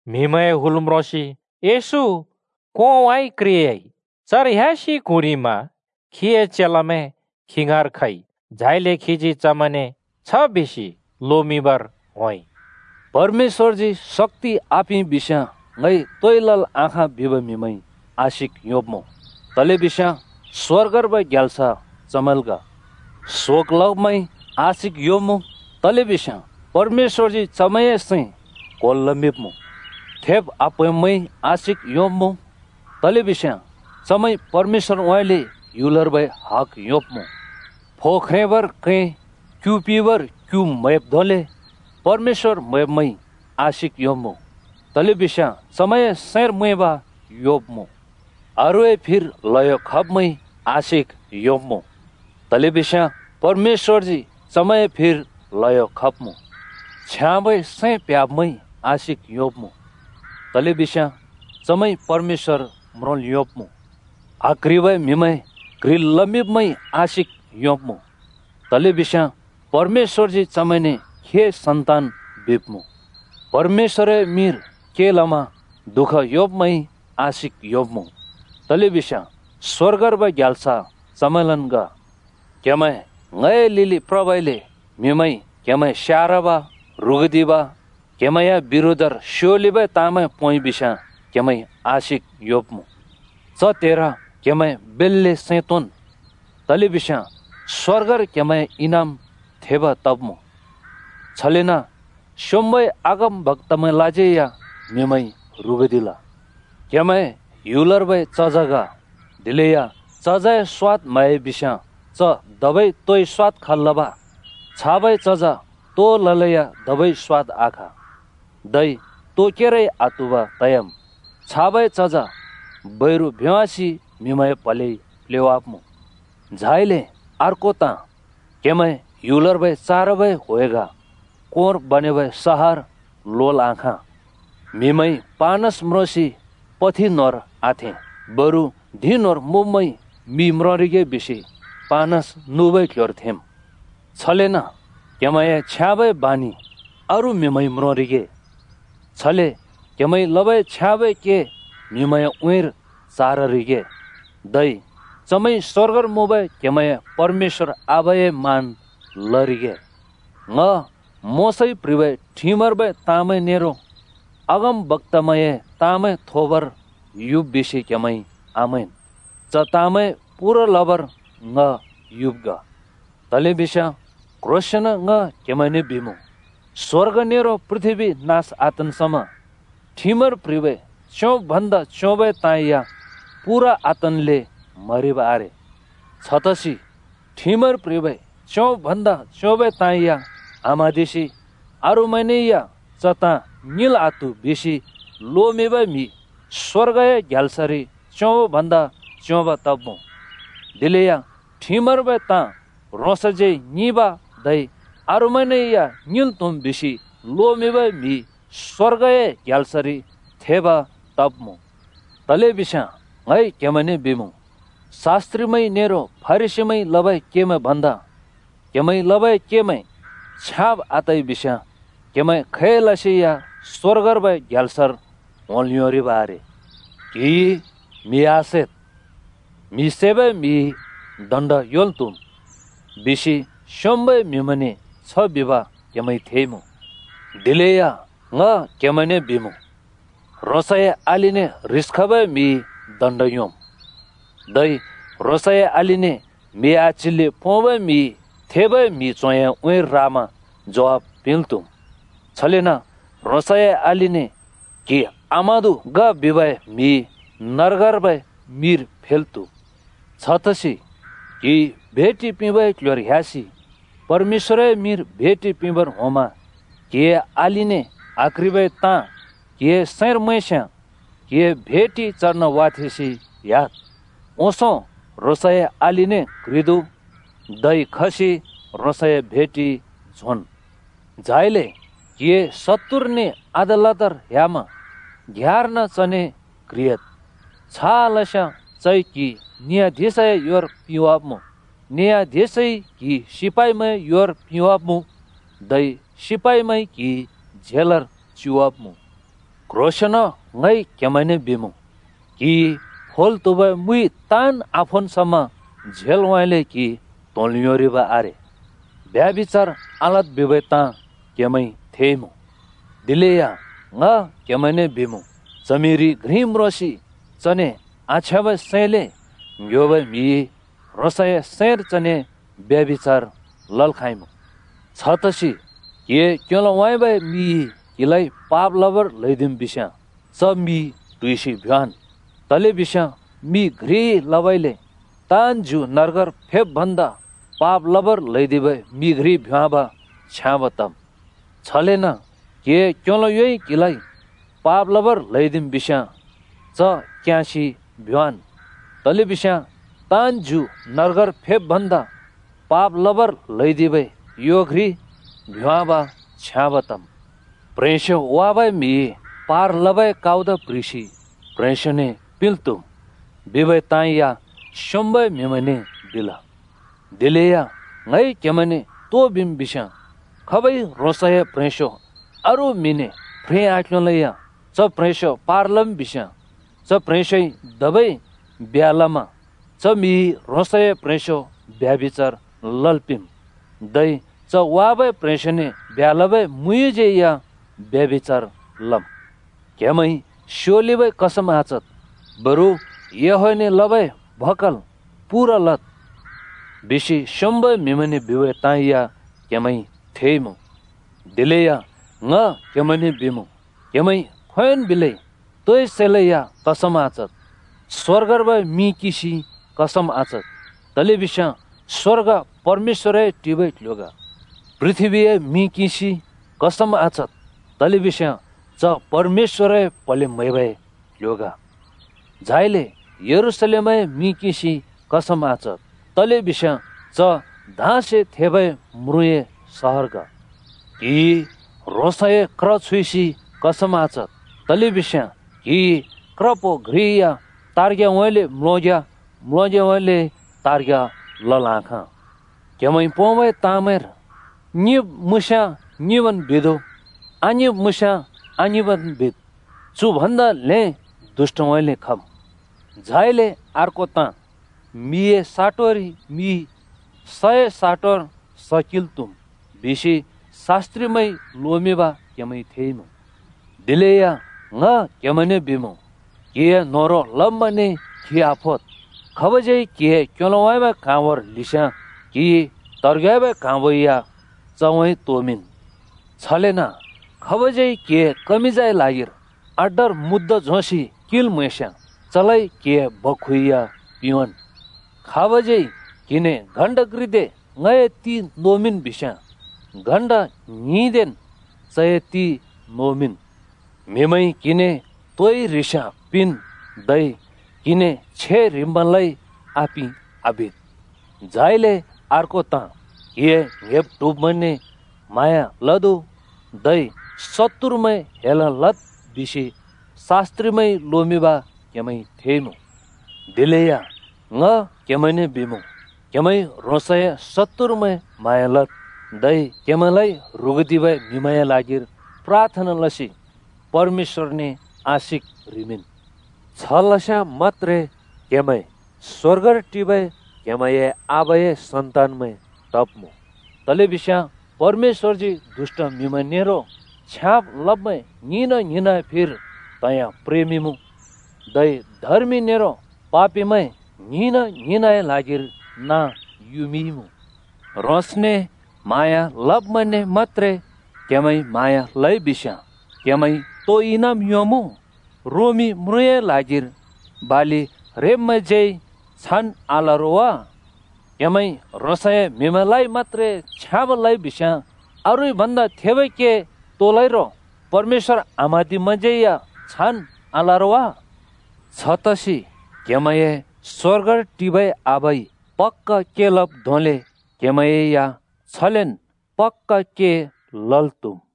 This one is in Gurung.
(म्हिमैंए हुल म्रोंसि येशू कोंउँइँ क्रेयाइ। चर ह्‍यासि क्हुँरिमा खीए चेलामैं खी ङाँर खइ। झाइले खीजी चमैंने छ बिसि लोमिंबर होंइ: “परमेश्‍वरजी शक्‍ति आपिंइ बिस्‍याँ ङइ तोइ लल् आखाँ बिबै म्‍हिमैंइ आशिक योंब्मुँ, तलेबिस्याँ स्‍वर्गर्बै ग्याल्स चमैंल् ग। शोक लब्‍मैंइ आशिक योंब्मुँ, तलेबिस्याँ परमेश्‍वरजी चमैंए सैं क्‍होल् लमिंब्‍मुँ। थेब् आप्‍हैंब्‍मैंइ आशिक योंब्मुँ, तलेबिस्याँ चमैंइ परमेश्‍वरउँइँले ह्‍युलर्बै हग योंब्‍मुँ। फो ख्रेंबर कैं, क्यु पिबर क्यु म्हैब् धोंले परमेश्‍वर म्हैब्मैंइ आशिक योंब्मुँ, तलेबिस्याँ चमैंए सैंर मैंब योब्मुँ। अरूए फिर ल्हयो खब्‍मैंइ आशिक योंब्मुँ, तलेबिस्याँ परमेश्‍वरजी चमैंए फिर ल्हयो खब्‍मुँ। छ्याँबै सैं प्‍ह्‍याब्‍मैंइ आशिक योंब्मुँ, तलेबिस्याँ चमैंइ परमेश्‍वर म्रोंल् योंब्‍मुँ। आक्‍ह्रिबै म्हिमैं क्ह्रिमिंब्मैंइ आशिक योंब्मुँ, तलेबिस्याँ परमेश्‍वरजी चमैंने खीए सन्‍तान बिब्‍मुँ। परमेश्‍वरए मिंर के लमा दुःख योंब्‍मैंइ आशिक योंब्मुँ, तलेबिस्याँ स्‍वर्गर्बै ग्याल्स चमैंलन् ग। “क्हेमैं ङए लिलि प्रबइले म्‍हिमैंइ क्‍हेमैं स्यारब, ह्रुगुदिब, क्हेमैंए बिरोधर स्योलिबै ताँमैं पोंइ बिस्याँ क्हेमैंइ आशिक योंब्मुँ। च त्हेर क्‍हेमैं बेल्‍‍ले सैं तोंन्, तलेबिस्याँ स्‍वर्गर क्‍हेमैंए इनाम थेब तब्मुँ। छलेन स्‍योंम्बै अगमबक्‍तामैंलाज्यै या म्‍हिमैंइ ह्रुगुदिल। “क्हेमैं ह्‍युलर्बै चज ग, दिलेया चजए स्वाद् म्‍हयाइ बिस्याँ च धबै तोइ स्वाद खल् लब? छाबै चज तो ललेया धबै स्‍वाद आखा, धै तो केरै आत्‍हुब तयाम्। छाबै चज बैरु भ्‍योंवासि म्हिमैंए प्हलेइ प्‍लेवाब्‍मुँ। “झाइले अर्को ताँ, क्‍हेमैं ह्‍युलर्बै चारबै ह्‍वे ग। कोंर बनेबै सहर लोल् आखाँ। म्हिमैंइ पानस म्रोसि पथि न्होंर आथें। बरु धिं न्होंर मुँब्मैंइ मि म्रोंरिगे बिसि पानस नुबै क्‍ल्‍ह्‍योर थेंम्। छलेन क्‍हेमैंए छ्याँबै बाँनि अरू म्‍हिमैंइ म्रोंरिगे। छले क्‍हेमैंइ लबै छ्याँबै के म्हिमैंए उँइँर चाररिगे। धै चमैंइ स्वर्गर मुँबै क्हेमैंए परमेश्‍वर आबाए मान लरिगे। “ङ मोशाइ प्‍ह्रिबै ठिमर्बै ताँमैं नेरो अगमबक्‍तामैंए ताँमैं थोबर युब बिसि क्हेमैंइ आमैंन्। च ताँमैं पूरा लबर ङ युब् ग। तलेबिस्याँ क्ह्रोंसेंन ङ क्हेमैंने बिमुँ, स्वर्ग नेरो पृथ्‍बी नास आतन् समा ठिमर प्ह्रिबै च्‍योंब भन्दा च्‍योंबै ताँ या पूरा आतन्ले म्‍हरिब् आरे। छतसि ठिमर प्ह्रिबै च्‍योंब भन्दा च्‍योंबै ताँ या आम्हाँदिसि अरूमैंने या ‘च ताँ ङिंल् आत्‍हु’ बिसि लोमिंबै म्हि स्वर्गए ग्याल्सरि च्‍योंब भन्दा च्‍योंब तब्‍मुँ। दिलेया ठिमर्बै ताँ ह्रोंसज्यै ङिंब धै अरूमैंने या ङिंल् त्‍हुम् बिसि लोमिंबै म्‍हि स्वर्गए ग्याल्सरि थेब तब्‍मुँ। “तलेबिस्याँ ङ क्‍हेमैंने बिमुँ, शास्‍त्रिमैंइ नेरो फरिसीमैंइ लबै केमैं भन्दा क्हेमैंइ लबै केमैं छ्याँब आतइ बिस्याँ क्हेमैं खैलसेया स्वर्गर्बै ग्याल्सरि होंल् योंरिब आरे। “‘क्हिइ म्हि आसैद्! म्‍हि सैबै म्हिइ दण्‍ड योंल् त्‍हुम्,’ बिसि स्योंम्बै म्हिमैंने छ बिब क्हेमैंइ थेइमुँ। दिलेया ङ क्‍हेमैंने बिमुँ, ह्रोंसए अलिने ह्रिस खबै म्हिइ दण्‍ड योंम्, धै ह्रोंसए अलिने म्हि आच्हिल्‍ले पोंबै म्हिइ थेबै म्हि च्होंए उँइँर रामा ज्वाफ पिंल् त्हुम्। छलेन ह्रोंसए अलिने ‘क्‍हि आमादु’ ग बिबै म्हि नर्गर्बै मिर फेल् त्हुब्मुँ। छतसि क्‍हिइ भेटि पिंबै क्ल्ह्‍योर ह्‍यासि परमेश्‍वरए मिंर भेटि पिंबर होंमा क्हिए अलिने आक्ह्रिबै ताँ क्हिए सैंर मैंस्याँ क्हिए भेटि चर्न वाथेंसि ह्‍याद्। ओंसों ह्रोंसए अलिने क्ह्रिदु, धै खसि ह्रोंसए भेटि झोंन्। “झाइले क्हिए शत्तुरने अदालतर ह्‍यामा घ्याँर्न चने क्ह्रियाद्। छ आलस्याँ चइ क्हि नियाधिशए योर पिवाब्मुँ। न्‍यायाधिशइ क्हि सिपाइमैंए योर पिवाब्मुँ, धै सिपाइमैंइ क्‍हि झेलर च्युवाब्‍मुँ। क्ह्रोंसेंन ङ क्हेमैंने बिमुँ, क्हिइ फोल् त्हुबै मुइ ताँन् आफोन् समा झेलउँइँले क्हि त्‍होंल् योंरिब् आरे। “ब्यभिचार आलद् बिबै ताँ क्हेमैंइ थेइमुँ। दिलेया ङ क्हेमैंने बिमुँ, च्हमिरि घ्रि म्रोंसि चने आछ्याँबै सैंले ङ्‍ह्‍योबै म्हिइ ह्रोंसए सैंर चने ब्यभिचार लल् खाँइमुँ! छतसि क्‍हिए क्‍योलोउँइँबै मिइ क्‍हिलाइ पाप लबर ल्हैदिम् बिस्याँ च मि ट्हुइसि भ्‍योंवाँन्। तलेबिस्याँ मि घ्रिइ लबउँइँले ताँन् ज्यु नर्गर फेब् भन्दा पाप लबर ल्‍हैदिबै मि घ्रि भ्योंवाँब छ्याँब तम्। छलेन क्‍हिए क्‍योलो योइ क्‍हिलाइ पाप लबर ल्‍हैदिम् बिस्‍याँ च क्‍याँसि भ्‍योंवाँन्। तलेबिस्याँ ताँन् ज्यु नर्गर फेब् भन्दा पाप लबर ल्‍हैदिबै यो घ्रि भ्योंवाँब छ्याँब तम्। “‘प्ह्रेंस्यो वाबै म्‍हिइ पार लबै काउद प्‍ह्रिसि प्ह्रेंस्योने पिंल् त्हुम्,’ बिबै ताँ या स्योंम्बै म्हिमैंने बिल। दिलेया ङइ क्‍हेमैंने तो बिम् बिस्‍याँ खाबइ ह्रोंसए प्‍ह्रेंस्‍यो अरू म्‍हिने फ्रें आक्ल्‍‍योंलेया च प्‍ह्रेंस्‍यो पार लम् बिस्याँ च प्‍ह्रेंस्‍योइ धबै ब्ह्‍‍या लमा च म्हिइ ह्रोंसए प्‍ह्रेंस्‍यो ब्यभिचार लल् पिंम्। धै च वाबै प्ह्रेंस्योने ब्ह्‍या लबै मुयुँज्यै या ब्यभिचार लम्। “‘क्‍हेमैंइ स्योलिबै कसम आचद्। बरु याहवेहने लबै भकल पूरा लद्,’ बिसि स्योंम्बै म्हिमैंने बिबै ताँ या क्‍हेमैंइ थेइमुँ। दिलेया ङ क्‍हेमैंने बिमुँ, क्‍हेमैंइ खोंयोंन् बिलै तोइ सैलै या कसम आचद्। स्‍वर्गए मिं किंसि कसम आचद्, तलेबिस्याँ स्वर्ग परमेश्‍वरए टिबै क्ल्ह्‍यो ग। पृथ्‍बीए मिं किंसि कसम आचद्, तलेबिस्याँ च परमेश्‍वरए प्‍हले न्‍हेबै क्‍ल्‍ह्‍यो ग। झाइले यरूशलेमए मि किंसि कसम आचद्, तलेबिस्याँ च धाँसे थेबै म्रुँए सहर ग। क्‍हिइ ह्रोंसए क्र छुइसि कसम आचद्, तलेबिस्याँ क्‍हिइ क्रप्हो घ्रि या तार्ग्‍याउँइँले म्‍लोंग्‍या, म्‍लोंग्‍याउँइँले तार्ग्‍या लल् आखाँ। क्हेमैंइ पोंबै ताँमैंर ‘ङिंब् मुँस्याँ ङिंबन् बिदु, आङिंब् मुँस्याँ आङिंबन् बिद्।’ चु भन्दा ल्हें दुष्‍टउँइँले खम्। “झाइले अर्को ताँ, ‘मिए साटोरि मि, सए साटोरि स किंल् त्‍हुम्’ बिसि शास्‍त्रिमैंइ लोमिंब क्‍हेमैंइ थेइमुँ। दिलेया ङ क्हेमैंने बिमुँ, क्‍हिए न्होह्रों लब्‍मैंने खि आफोद्। खाबज्यै क्‍हिए क्‍योलोउँइँबै क्ह्राँबोर ल्हिस्‍याँ क्‍हिइ त्हेब्रेउँइँबै क्ह्राँबो या चउँइँ तोमिंन्। छलेन खाबज्‍यै क्‍हिए कमिजए ल्हागिर अड्डार मुद्दा झोंसि किंल् म्हैस्‍याँ चलाइ क्‍हिए बक्‍खु या पिंवाँन्। खाबज्यै क्‍हिने ‘घण्टा घ्रिदे ङए ति नोबिन् बिस्याँ’ घण्टा ङ्हिंदेन् चए ति नोबिन्। म्हिमैंइ क्‍हिने तोइ ह्रिसयाँ पिंन्, धै क्‍हिने छे ह्रिब्मैंलाइ ‘आपिं!’ आबिद्। “झाइले अर्को ताँ, ‘क्हिए ङ्‍हेब्-ट्हुब्मैंने म्हाँया लदु, धै शत्तुरमैं हेल् लद्’ बिसि शास्‍त्रिमैंइ लोमिंब क्‍हेमैंइ थेइमुँ। दिलेया ङ क्‍हेमैंने बिमुँ, क्‍हेमैंइ ह्रोंसए शत्तुरमैं म्हाँया लद्, धै क्‍हेमैंलाइ ह्रुगुदिबै म्हिमैंए ल्हागिर प्राथना लसि परमेश्‍वरने आशिक ह्रिमिंन्। छ लस्‍याँ मत्‍त्रे क्‍हेमैं स्‍वर्गर टिबै आबाए सन्‍तान तब्‍मुँ। तलेबिस्याँ परमेश्‍वरजी दुष्‍ट म्हिमैं नेरो छ्याँब् लब्मैं ङ्हिंना-ङ्हिंनए फिर त्‍हिंयाँ प्रेमिंमुँ, धै धर्मि नेरो पापिमैं ङ्हिंना ङ्हिंनए ल्हागिर नाँ युमिंइमुँ। ह्रोंसने म्हाँया लब्‍मैंने मत्‍त्रे क्‍हेमैंइ म्हाँया लइ बिस्‍याँ क्हेमैंइ तो इनाम योंमुँ? रोमी म्रुँए ल्हागिर बालि रेब्मैंज्यै छान् आल रो वा? क्‍हेमैंइ ह्रोंसए म्हिमैंलाइ मत्‍त्रे छ्याँब् लइ बिस्याँ अरूइ भन्दा थेबै के तो लइ रो? परमेश्‍वर आम्हाँदिब्मैंज्‍यै या छान् आल रो वा? छतसि क्‍हेमैंए स्‍वर्गर टिबै आबा पक्‍का के लब् धोंले क्हेमैं या छलेन् पक्‍का के लल् त्हुमुँ।”